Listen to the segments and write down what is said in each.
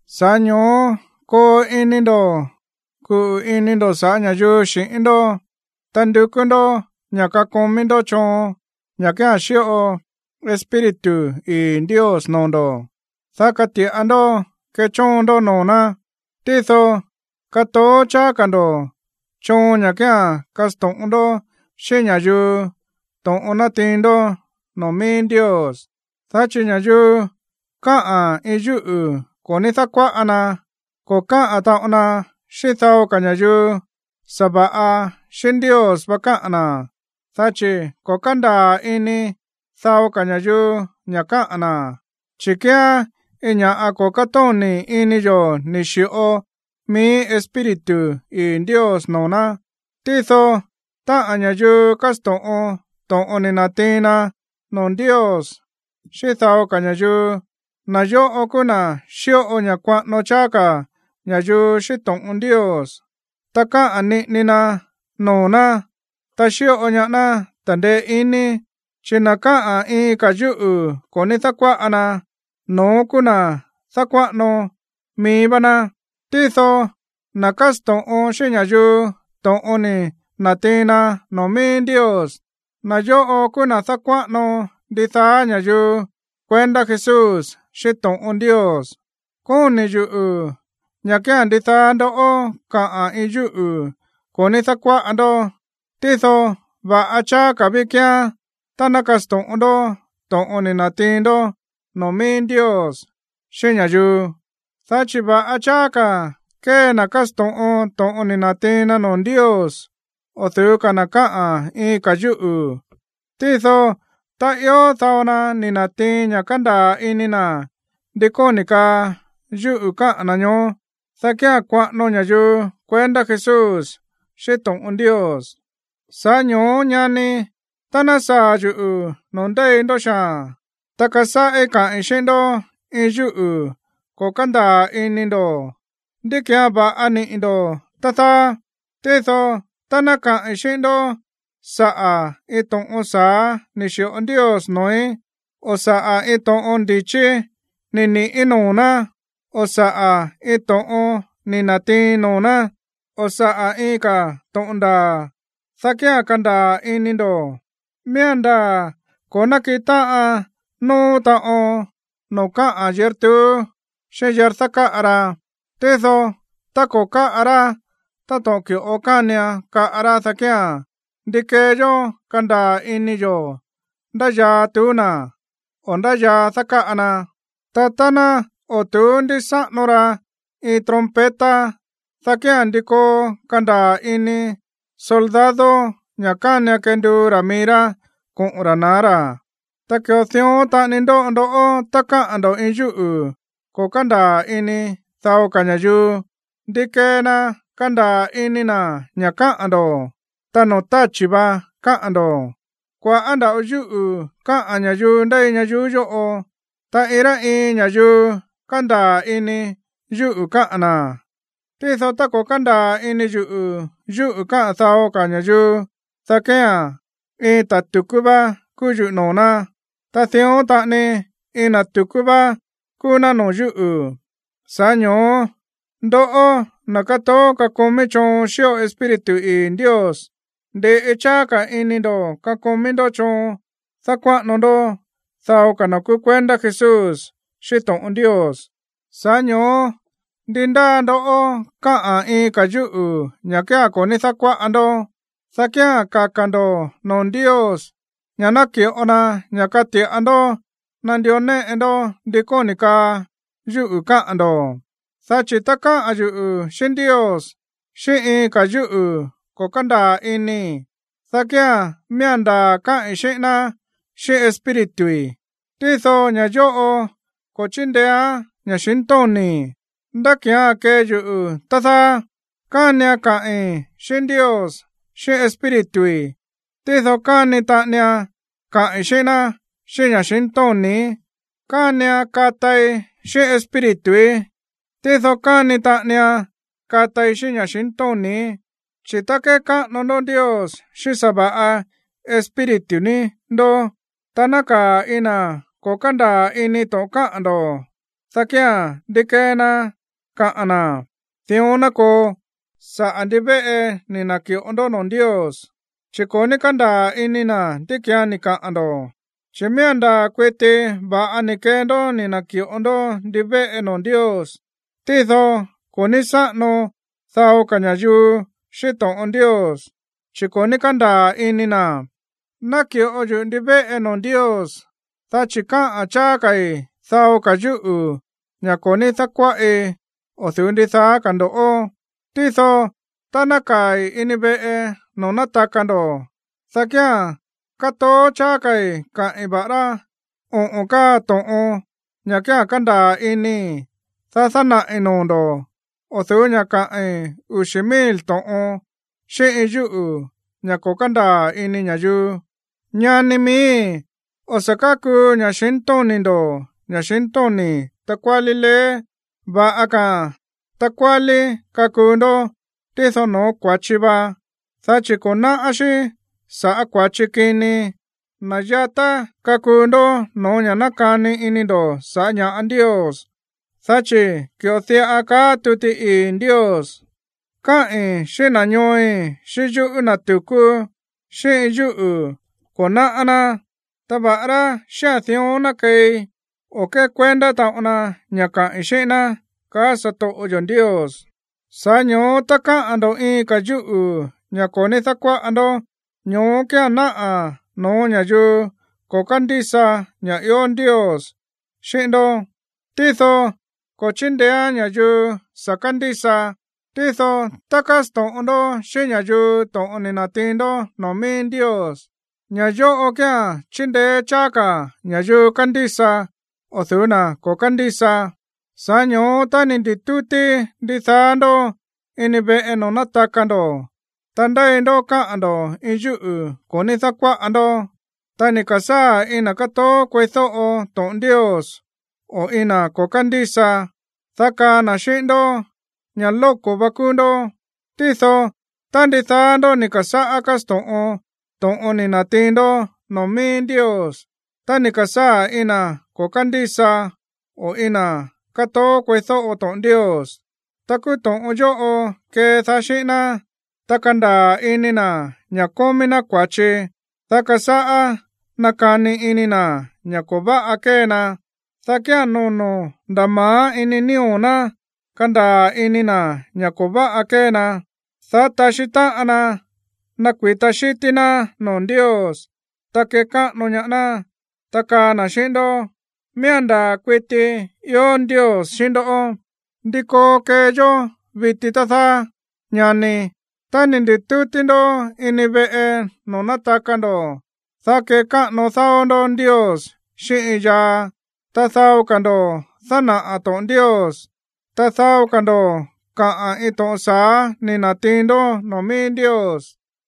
Sa̱ꞌá ño̱ó koo ini ndo̱ kuꞌu̱ ini ndo̱ sa̱ꞌá ña̱yuu xi̱ꞌín ndó. Ta ndukú ndó ña̱ kakomí ndó choon, ña̱ kía̱n xíꞌo Espíritu ii̱ Ndios noo̱ ndo̱, dá kati̱ꞌa ndó kechóon ndó noo̱ ná. Tído katoó cháá ka̱ ndo̱ choon ña̱ kía̱n kásto̱ꞌon ndó xíꞌín ña̱yuu to̱ꞌon nátiin ndó noo̱ mií Ndios. Dá chi̱ ña̱yuu káꞌa̱n iin yúꞌu̱ ko̱ ní dákuáꞌa na, ko̱ káꞌa̱n taꞌon na xíꞌín dao ka̱ ña̱yuu, sa̱va̱ꞌa xíꞌín Ndios vá káꞌa̱n na̱, dá chi̱ ko̱ kándaa̱ ini dao ka̱ ña̱yuu ña̱ káꞌa̱n na̱, chi̱ kíán iin ña̱ꞌa ko̱ kátóni̱ ini yo̱ ni̱ xi̱ꞌo mií Espíritu ii̱ Ndios noo̱ ná. Tído táꞌa̱n ña̱yuu kásto̱ꞌon to̱ꞌon ni̱ na̱tiin na noo̱ Ndios xíꞌín dao ka̱ ña̱yuu, na̱ yóꞌo kúú na̱ xíꞌo ña̱ kuaꞌano cháá ka̱ ña̱yuu xíꞌín to̱ꞌon Ndios, ta káꞌa̱n niꞌini na noo̱ ná, ta xíꞌo ñaá ná ta̱ndeé iní. Chi̱ na̱ káꞌa̱n iin ka̱ yúꞌu̱ ko̱ ní dákuáꞌa na, no̱ón kúú na̱ dákuáꞌano mií vá ná. Tído na̱ kásto̱ꞌon xíꞌín ña̱yuu to̱ꞌon ni̱ na̱tiin na noo̱ mií Ndios, na̱ yóꞌo kúú na̱ dákuáꞌano ndidaá ña̱yuu kuendá Jesús xíꞌín to̱ꞌon Ndios. Kóni̱ yuꞌu̱ ña̱ kía̱n ndidaá ndó kaꞌa̱n iin yúꞌu̱ ko̱ ní dákuáꞌa ndó, tído va̱ꞌa cháá ka̱ ví kíán tá ná kasto̱ꞌon ndó to̱ꞌon ni̱ na̱tiin ndó noo̱ mií Ndios xíꞌín ña̱yuu. Dá chi̱ va̱ꞌa cháá ka̱ kée na̱ kásto̱ꞌon to̱ꞌon ni̱ na̱tiin na noo̱ Ndios o̱ du̱ú ka̱ na̱ káꞌa̱n iin ka̱ yúꞌu̱. Tído tá ió dao na ni̱ na̱tiin ña̱ kándaa̱ ini na̱ ndi kóni̱ kaa yúꞌu̱ káꞌa̱n na̱ ñoó, dá kía̱n kuaꞌano ña̱yuu kuendá Jesús xíꞌín to̱ꞌon Ndios. Sa̱ꞌá ño̱ó, ñani, tá ná saa̱ yuꞌu̱ noo̱ ndéi ndó xaa̱n, ta kasáꞌí kaꞌi̱n xíꞌín ndó iin yúꞌu̱ ko̱ kándaa̱ ini ndo̱, ¿ndí ki̱án va̱ꞌa niꞌi̱ ndo̱, tá dáá? Tído tá ná kaꞌi̱n xíꞌín ndó saꞌa̱ iin to̱ꞌon sa̱á ni̱ xi̱ꞌo Ndios noo̱í, o saꞌa̱ iin to̱ꞌon ndi̱chí ni̱ ni̱ꞌí noo̱ ná, o saꞌa̱ iin to̱ꞌon ni̱ na̱tiiin noo̱ ná, o saꞌa̱ iin ka̱ to̱ꞌon ndaa̱, dá kía̱n kandaa̱ ini ndo̱. Miía̱n ndaa̱ ko̱ nákiꞌin táꞌan nóó taꞌon noo̱ káꞌa̱n yír tuú xíꞌín yír dákáꞌa ra. Tído tá ko̱ káꞌa rá táto̱ꞌon ki̱ꞌo kánian kaꞌa rá, dá kía̱n, ¿ndi kee yó kandaa̱ ini yo̱ ndá yaa tuú na̱, o ndá yaa dákáꞌa na? Ta tá ná o̱ tu̱ú ndísáꞌano ra iin trompeta, dá kía̱n, ¿ndi koo kandaa̱ ini soldado ña̱ kánian kenduu ra̱ mií rá koꞌo̱n ra̱ na̱á ra̱? Ta ki̱ꞌo dión taꞌani ndóꞌo ndoꞌó tá káꞌa̱n ndo̱ iin yúꞌu̱ ko̱ kándaa̱ ini dao ka̱ ña̱yuu. ¿Ndi kee na kandaa̱ ini na̱ ña̱ káꞌa̱n ndo̱? Ta noo̱ táchi̱ vá káꞌa̱n ndo̱. Kua̱ꞌá nda̱ꞌo yúꞌu̱ káꞌa̱n ña̱yuu ndéi ñayuú yóꞌo, ta iin rá iin ña̱yuu kándaa̱ ini yúꞌu̱ káꞌa̱n na̱. Tído tá ko̱ kándaa̱ ini yuꞌu̱ yúꞌu̱ káꞌa̱n dao ka̱ ña̱yuu, dá kía̱n iin ta̱ tu̱kú vá kúú yuꞌu̱ noo̱ ná. Ta dión taꞌani iin na̱ tu̱kú vá kúú ná noo̱ yúꞌu̱. Sa̱ꞌá ño̱ó ndoꞌó, na̱ kátoó kakomí choon xíꞌo Espíritu ii̱ Ndios, ndi̱ꞌi cháá ka̱ ini ndo̱ kakomí ndó choon dákuáꞌano ndó dao ka̱ na̱ kúú kuendá Jesús xíꞌín to̱ꞌon Ndios. Sa̱ꞌá ño̱ó ndi ndáa ndó káꞌa̱n iin ka̱ yúꞌu̱ ña̱ kía̱n ko̱ ní dákuáꞌa ndó, dá kía̱n kaka̱ ndo̱ noo̱ Ndios ña̱ ná ki̱ꞌo na ña̱ kati̱ꞌa ndó nandió néꞌe ndó ndi kóni̱ kaa yúꞌu̱ káꞌa̱n ndo̱. Dá chi̱ tá káꞌa̱n yuꞌu̱ xíꞌín Ndios xíꞌín iin ka̱ yúꞌu̱ ko̱ kándaa̱ inii̱, dá kía̱n miía̱n ndaa̱ káꞌi̱n xíꞌín ná xíꞌín espírituí, tído ña̱ yóꞌo ko̱ chíndeéán ña̱xintóni̱í. ¿Ndá ki̱án kee yuꞌu̱, tá dáá? Kánian kaꞌi̱n xíꞌín Ndios xíꞌín espírituí, tído káni taꞌanian kaꞌi̱n xíꞌín ná xíꞌín ña̱xintóni̱í. Kánian katai xíꞌín espírituí, tído káni taꞌanian katai xíꞌín ña̱xintóni̱í. Chi̱ tá kékáꞌano ndó Ndios xíꞌín sa̱va̱ꞌa espíritu ní ndó, ta nákaa̱ iin na̱ ko̱ kándaa̱ ini to̱ꞌon káꞌa̱n ndo̱, dá kía̱n, ¿ndi kee na kaa na̱: “Dión ná koo”, sa̱ꞌá ndivéꞌe ni̱ na̱ki̱ꞌo ndó noo̱ Ndios? Chi̱ ko̱ ní kándaa̱ ini na̱ ndí ki̱án ni̱ kaꞌa̱n ndo̱. Chi̱ miía̱n ndaa̱ kuiti va̱ꞌa ni̱ kee ndó ni̱ na̱ki̱ꞌo ndó ndivéꞌe noo̱ Ndios, tído ko̱ ní sáꞌano dao ka̱ ña̱yuu xíꞌín to̱ꞌon Ndios, chi̱ ko̱ ní kándaa̱ ini na̱. Náki̱ꞌo yuꞌu̱ ndivéꞌe noo̱ Ndios, dá chi̱ káꞌa̱n cháá ka̱i̱ dao ka̱ yúꞌu̱, ña̱ ko̱ ní dákuáꞌi, o̱ du̱ú ndidaá ka̱ ndo̱ꞌó. Tído tá nákaa̱i̱ ini veꞌe noo̱ nátaka ndo̱, dá kía̱n kátoó cháá ka̱i̱ káꞌi̱n va̱ꞌará oꞌo̱n káa to̱ꞌon, ña̱ kía̱n kándaa̱ inii̱, dá dánaꞌi̱ noo̱ ndo̱, o̱ du̱ú ña̱ kaꞌi̱n uxi̱ mil to̱ꞌon xíꞌín iin yúꞌu̱, ña̱ ko̱ kándaa̱ ini ña̱yuu. Ñani miíi̱, o̱ sa̱ kákuu ña̱xintóni̱ ndo̱ ña̱xintóni̱ takuálí leé. Va̱ꞌa ka̱a̱n takuálí kakuu ndó, tído no̱ó kua̱chi va, dá chi̱ ko̱ náꞌá xí sa̱ꞌá kua̱chi kini. Na̱ yatá kakuu ndó no̱ó ña̱ nákani ini ndo̱ sa̱ꞌá ña̱ꞌa Ndios. Dá chi̱ ki̱ꞌo diꞌa kaá tuti ii̱ Ndios: “Kaꞌi̱n xíꞌín na̱ ñooi̱ xíꞌín yúꞌu̱ na̱ tu̱kú, xíꞌín iin yúꞌu̱ ko̱ náꞌá ná. Ta va̱ꞌará xíꞌa̱n dión ná keei, o̱ kékuendá taꞌon na ña̱ kaꞌi̱n xíꞌín ná, kaá satoꞌo yo̱ Ndios.” Sa̱ꞌá ño̱ó, tá káꞌa̱n ndo̱ iin ka̱ yúꞌu̱, ña̱ ko̱ ní dákuáꞌa ndó, ño̱ó kía̱n náꞌa̱ no̱ó ña̱yuu ko̱ kándísa ña̱ ió Ndios xíꞌín ndó, tído ko̱ chíndeéán ña̱yuu sa̱ kándísa. Tído tá kásto̱ꞌon ndó xíꞌín ña̱yuu to̱ꞌon ni̱ na̱tiin ndó noo̱ mií Ndios, ña̱ yóꞌo kía̱n chíndeé cháá ka̱ ña̱yuu kándísa o̱ du̱ú na̱ ko̱ kándísa. Sa̱ꞌá ño̱ó tá ni̱ ndi̱tútí ndidaá ndó ini veꞌe noo̱ nátaka ndo̱, ta ndéi ndó káꞌa̱n ndo̱ iin yúꞌu̱ ko̱ ní dákuáꞌa ndó, ta ni̱ ka̱sáa̱ iin na̱ kátoó kueídóꞌo to̱ꞌon Ndios o iin na̱ ko̱ kándísa, dá kaa na̱ xíꞌín ndó ña̱ lóko̱ va kúú ndó. Tído tá ndidaá ndó ni̱ ka̱sáꞌá kásto̱ꞌon to̱ꞌon ni̱ na̱tiin ndó noo̱ mií Ndios, ta ni̱ ka̱sáa̱ iin na̱ ko̱ kándísa o iin na̱ kátoó kueídóꞌo to̱ꞌon Ndios, ta kúú to̱ꞌon yóꞌo kedaá xíꞌín ná, ta kandaa̱ ini na̱ ña̱ kómí ná kua̱chi, dá kasáꞌá nakani ini na̱ ña̱ ko̱ váꞌa kée na. Dá kía̱n nono̱ nda̱ ma̱á ini nío̱ ná kandaa̱ ini na̱ ña̱ ko̱ váꞌa kée na, dá taxí táꞌan na nakui̱ta xítí ná noo̱ Ndios, ta kekáꞌano ñaá ná. Ta kaa na̱ xíꞌín ndó: “Miía̱n ndaa̱ kuiti ió Ndios xíꞌín ndó.” ¿Ndi koo kee yó viti, tá dáá, ñani? Tá ni̱ ndi̱tútí ndó ini veꞌe noo̱ nátaka ndo̱, dá kekáꞌano dao ndó Ndios xíꞌín iin yaa, ta dao ka̱ ndo̱ dánaꞌa̱ to̱ꞌon Ndios, ta dao ka̱ ndo̱ kaꞌa̱n iin to̱ꞌon sa̱á ni̱ na̱tiin ndó noo̱ mií Ndios,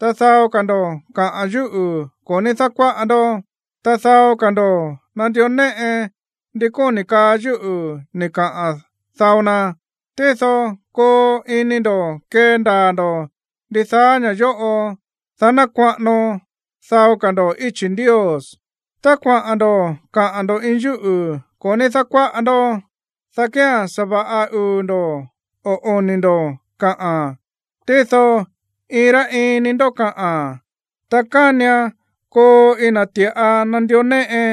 ta dao ka̱ ndo̱ kaꞌa̱n yúꞌu̱ ko̱ ní dákuáꞌa ndó, ta dao ka̱ ndo̱ nandió néꞌe ndi kóni̱ kaa yúꞌu̱ ni̱ kaꞌa̱n dao na. Tído koo ini ndo̱ kendaa̱ ndo̱ ndidaá ña̱ yóꞌo, dá ná kuaꞌano dao ka̱ ndo̱ íchi̱ Ndios. Tá kuaꞌa̱n ndo̱ kaꞌa̱n ndo̱ iin yúꞌu̱ ko̱ ní dákuáꞌa ndó, dá kía̱n sa̱va̱ꞌa uu̱ ndo̱, o oni̱ ndo̱ kaꞌa̱n. Tído iin rá iin ni ndó kaꞌa̱n. Ta kánian koo iin na̱ ti̱ꞌa nandió néꞌe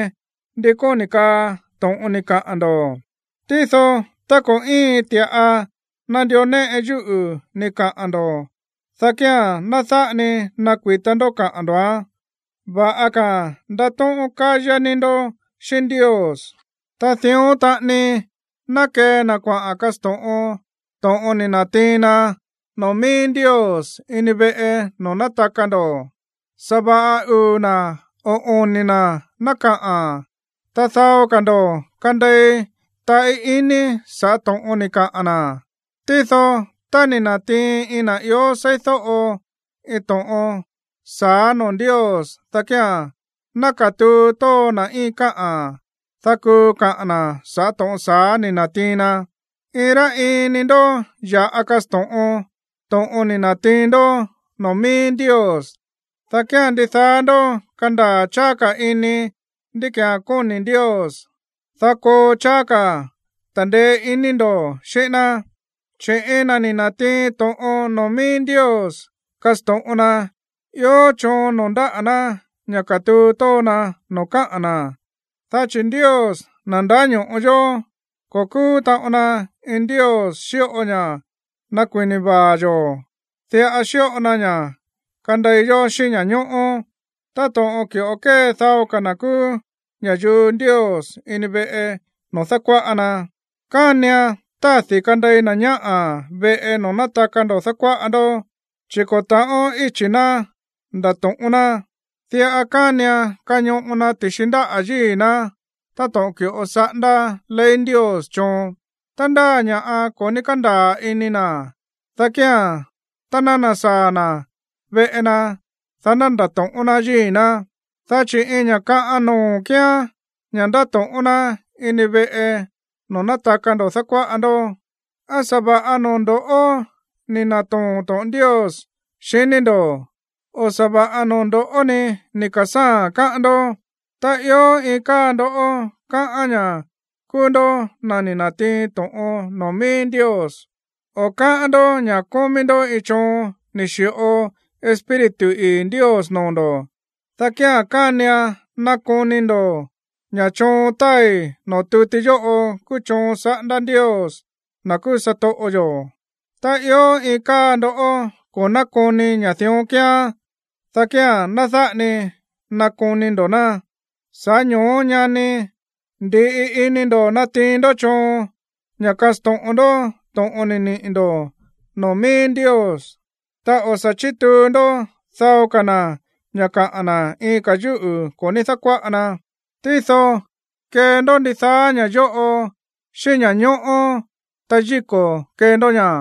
ndi kóni̱ kaa to̱ꞌon ni̱ kaꞌa̱n ndo̱. Tído tá ko̱ íin ti̱ꞌa nandió néꞌe yúꞌu̱ ni̱ kaꞌa̱n ndo̱, dá kía̱n ná dáꞌa ni nakui̱ta ndó kaꞌa̱n ndo̱án. Va̱ꞌa ka̱a̱n ndatóꞌón kayá ni ndó xíꞌín Ndios. Ta dión taꞌani ná kee na̱ kuaꞌa̱n kasto̱ꞌon to̱ꞌon ni̱ na̱tiin na noo̱ mií Ndios ini veꞌe noo̱ nátaka ndo̱. Sa̱va̱ꞌa uu̱ na̱, o oni̱ na̱ ná kaꞌa̱n. Ta dao ka̱ ndo̱ kandei taꞌí iní sa̱ꞌá to̱ꞌon ni̱ kaꞌa̱n na̱. Tído tá ni̱ na̱tiin iin na̱ ió seídóꞌo iin to̱ꞌon sa̱á noo̱ Ndios, dá kía̱n ná katuu tóo na̱ íin káꞌa̱n, dá kuu kaꞌa̱n na̱ sa̱ꞌá to̱ꞌon sa̱á ni̱ na̱tiin na. Iin rá iin ni ndó ya̱ꞌa kasto̱ꞌon to̱ꞌon ni̱ na̱tiin ndó noo̱ mií Ndios, dá kía̱n ndidaá ndó kandaa̱ cháá ka̱ ini ndí ki̱án kóni̱ Ndios, dá koo cháá ka̱ ta̱ndeé iní ndo̱ xíꞌín ná. Chi̱ iin na̱ ni̱ na̱tiin to̱ꞌon noo̱ mií Ndios kasto̱ꞌon na, ió choon noo̱ ndáꞌa̱ ná ña̱ katuu tóo na noo̱ káꞌa̱n na̱, dá chi̱ Ndios, na̱ ndáño̱ꞌo yó, ko̱ kúú taꞌon na iin Ndios xíꞌo ña̱ nakui̱na vaa̱ yo̱. Diꞌa xíꞌo na ña̱ kandei yó xíꞌín ña̱ñóꞌó. Táto̱ꞌon ki̱ꞌo kée dao ka̱ na̱ kúú ña̱yuu Ndios ini veꞌe noo̱ dákuáꞌa na, kánian tádi̱ kandei na̱ ñáꞌa̱ veꞌe noo̱ nátaka ndo̱ dákuáꞌa ndó, chi̱ ko̱ ta̱ꞌón íchi̱ ná ndatóꞌón ná. Diꞌa kánian kañoꞌo na ti̱xi ndáꞌa̱ yíi̱ ná táto̱ꞌon ki̱ꞌo saꞌándá ley Ndios choon. Tá ndáa ña̱ꞌa ko̱ ní kándaa̱ ini na̱, dá kía̱n tá ná nasaa̱ na̱ veꞌe na, dá ná ndato̱ꞌón ná yíi̱ ná. Dá chi̱ iin ña̱ kaꞌan noo̱ kíán ña̱ ndatóꞌón ná ini veꞌe noo̱ nátaka ndo̱ dákuáꞌa ndó. ¿Á sa̱va̱ꞌa noo̱ ndo̱ꞌó ni̱ na̱too̱n to̱ꞌon Ndios, xiní ndo̱? O, ¿á sa̱va̱ꞌa noo̱ ndo̱ꞌó ní ni̱ ka̱sáa̱a̱n, káꞌán ndó? Tá ió iin káa ndó káꞌán ña̱ kúú ndó na̱ ni̱ na̱tiin to̱ꞌon noo̱ mií Ndios, o káꞌán ndó ña̱ kómí ndó iin choon ni̱ xi̱ꞌo Espíritu ii̱ Ndios noo̱ ndo̱, dá kía̱n kánian nakoni ndo̱ ña̱ choon táai noo̱ tuti yóꞌo kúú choon saꞌándá Ndios, na̱ kúú satoꞌo yo̱. Tá ió iin káa ndó ko̱ nákoni ña̱ dión kíán, dá kía̱n ná dáꞌa ni nakoni ndo̱ ná. Sa̱ꞌá ño̱ó, ñani, ndi̱ꞌi ini ndo̱ natiin ndó choon ña̱ kasto̱ꞌon ndó to̱ꞌon ni̱ niꞌi̱ ndo̱ noo̱ mií Ndios. Ta o̱ sa̱ chítuu ndó dao ka̱ na̱ ña̱ kaꞌa̱n na̱ iin ka̱ yúꞌu̱ ko̱ ní dákuáꞌa na, tído kee ndó ndidaá ña̱ yóꞌo xíꞌín ña̱ñóꞌó, ta yíko̱ kee ndó ña̱.